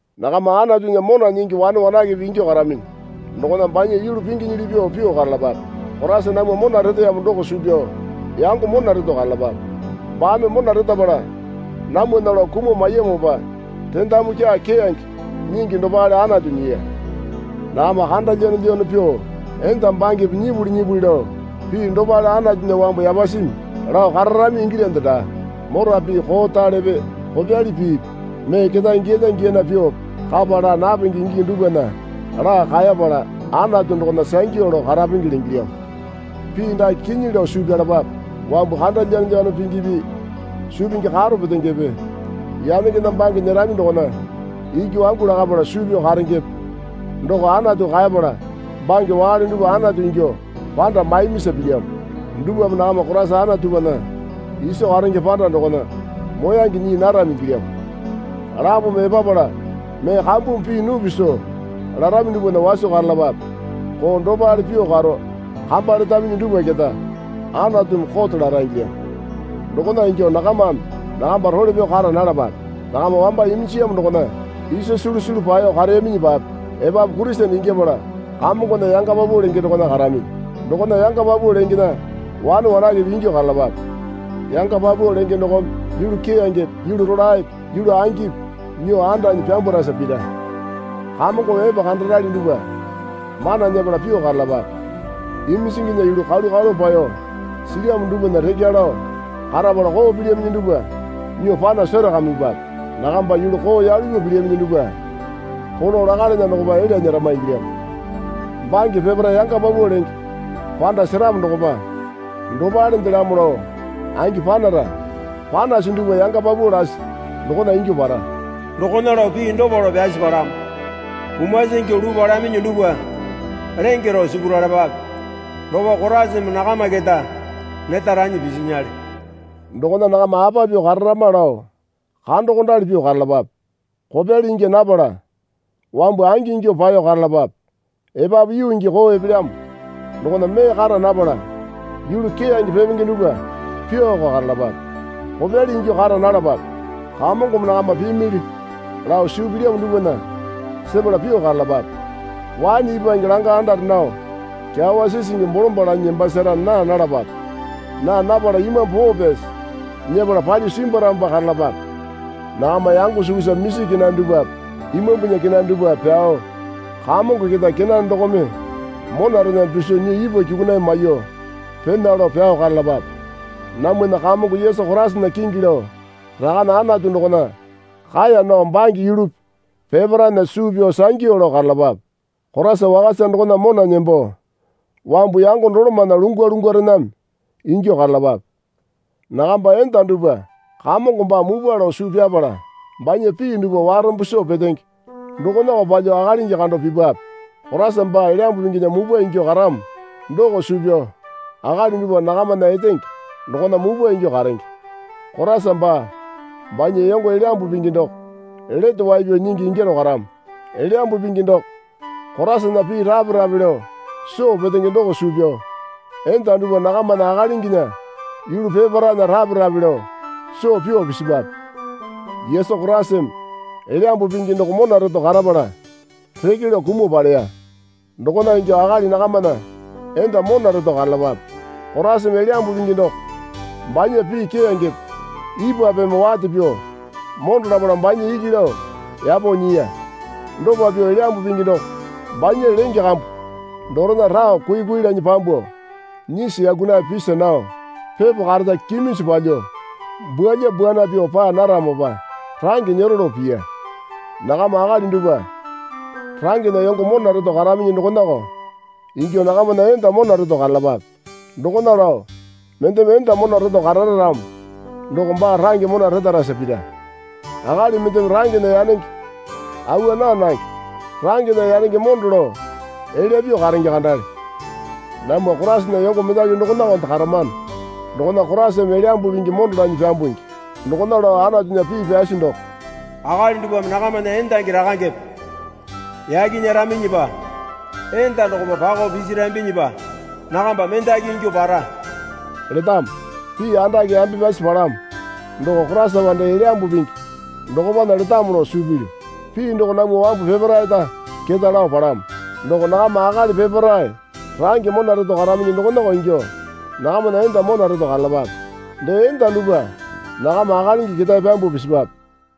Nakama Anatunya mona nyingi wane wanakepe ingyuo karaminyi dokona banya yulu pinginyili pyuo pyuo karalapape. Koraisa namwa mona reteyamo doko suu pyao yango mona reto karalapape. Baame mona retapala namwana lao kumuo maiyamopa rendamu kyaa keyange nyingi dopale Anatu nyiya. Nakama kanda lyanolyano pyuo enda bangepe nyipuli nyipuli lao pii dopale Anatunya wambu yapasimi lao kararami ingilyande daa. Mora pii koralepe kopyali piipi mee ketae giyalya giyana pyuope kapa laa napenge ingingi dupwana laa kaepala Anatu dokona sangyu lao karapengele ingilyamo. Pii dake kinyi lao suu pyalapape. Wambu kando lyanolyano pingipi suu pingi karo petengepe yanengena bange nyerami dokona iki wangu lakapala suu pyao karengepe (doko Anatu kaepala bange wakale dupwa Anatu ingyuo panda maimisa pilyamo) dupwame nakama Koraisa Anatupana iso karenge panda dokona moyange nyii narami ingilyamo. Lapome epapala mee kambumi pii nupi soo larami dupwana waso karalapape. Koo dopale pyuo karo kamba letaminyi dupwa keta Anatumi kote lara ingilyamo. Dokona ingyuo nakamame nakamba role pyao kara nalapape. Nakama wamba iminjiyamo dokona isa sulu sulu paeyo kareyaminyipape epapu Kurisene ingyapala Kamongona yanga paupau lenge dokona karaminyi. Dokona yanga paupau lengena wane wanakepe ingyuo karalapape. Yanga paupau lenge dokome yulu keyangepe yulu rolaepe yulu angipi nyuo andanyi pyambwarasa pira. Kamongome epe kandarali dupwa mana nyepala pyuo karalapape. Iminjinginya yulu kalu kalu paeyo silyamo dupwana rekya lao karapala koo pilyaminyi dupwa nyuo pano serakamipape. (Nakamba yulu koo yalu pyuo pilyaminyi dupwa polo lakalana dokopa elya nyerama ingilyamo.) Bange peparae yanga paupau lenge panda seramo dokopa dopalendelamo lao angi panara. Panasi dupwa yanga paupau lasi dokona ingyuo para. Dokona lao pii dopa lao pyasi palamo. Kumasi ingyuo luu palaminyi dupwa lenge rao sipuralapape dokopa Koraisame nakama keta neta ranyi pisinyale. Dokona nakama apa pyuo kararama lao kandokondali pyuo karalapape. Kopyali ingya napala wambu angi ingyuo paeyo karalapape. Epapu yuu gii koo epelyamo dokona mee kara napala yulu keyange pepenge dupwa pyuoko karalapape. Kopyali ingyuo kara nalapape. Kamongome nakama pimili lao suu pilyamo dupwana sepala pyuo karalapape. Waene ipwange langa andare nao kyawa sisingi bolombalo lanyi nembasasara naa nalapape. Naa napala Imambu Poo Pyasi nyepala palyuo simbwaramopa karalapape. Nakama yango sukusa misi kenane dupwape Imambunya kenane dupwape pyao, Kamongo keta kenane dokome monarename piso nyuo ipwa kyukunaiye maiyuo pena lao pyao karalapape. Namwana Kamongo Yesu Koraisana kingi lao Rakane Anatu dokona kaeya nao bange yulupi peparaena suu pyao sangyu lao karalapape. Koraisa wakasa dokona mona nembo wambu yango dolomana lungwa lungwarename ingyuo karalapape. Nakamba enda dupwa Kamongo baa mupwa lao suu pyapala banya pii dupwa warombo soo petenge dokonako palyuo akalingi kando pipwape. Koraisa baa Elyambu Pinginya mupwa ingyuo karamo doko suu pyao akali dupwa nakamana etenge dokona mupwa ingyuo karenge. Koraisa baa banya yango Elyambu Pingi doko Lete Wai Pyao Nyingi ingyaro karamo. Elyambu Pingi doko Koraisana pii rape rape lao soo petenge doko suu pyao enda dupwa nakamana akalinginya yulu peparaena rape rape lao soo pyuo pisipape. Yesu Koraisame Elyambu Pingi doko mona reto karapala reke lao kumuo paleya. Dokona ingyuo akali nakamana enda mona reto karalapape. Koraisame Elyambu Pingi doko, banya pii keyangepe ipwapeme wate pyuo mondo lapala banya iki lao yapo nyiya. Dopa pyuo Elyambu Pingi doko banya lenge kambu dorena rao kui kui lanyi pyambuo, nyisi yaku nayape pisi nao, pepo kareta kiminju palyuo bwualyambwuana pyuo paa naramopa range nyero lao piya. Nakama akali dupwa rangena yongo mona reto karaminyi dokonako ingyuo nakamana enda mona reto karalapape. Dokona lao mendeme enda mona reto karara ramo doko baa range mona retarasa pira. (Akali mendeme rangena yanenge awa naa nange. Rangena yanenge mondo lao elya pyuo karenge kandale. Namwa Koraisana yongo mendaki dokonakonde karamano dokona Koraisame Elyambu Pingi mondo lanyi pyambungi.) Dokona lao Anatunya pii pyasi doko, Akali dupwame nakamana endangi rakangepe yaki nyeraminyipa enda dokopa pakao pisirambinyipa nakamba mendaki ingyuo para letamo. Pii andake yambe pyasi palamo doko Koraisapa dee Elyambu Pingi dokopana letamo lao suu pilyu. Pii doko namwa wambu peparaeta keta lao palamo. Doko nakama akali peparae range mona reto karaminyi dokonako ingyuo nakamana enda mona reto karalapape. Dee enda dupwa nakama akalingi ketae pyambuo pisipape.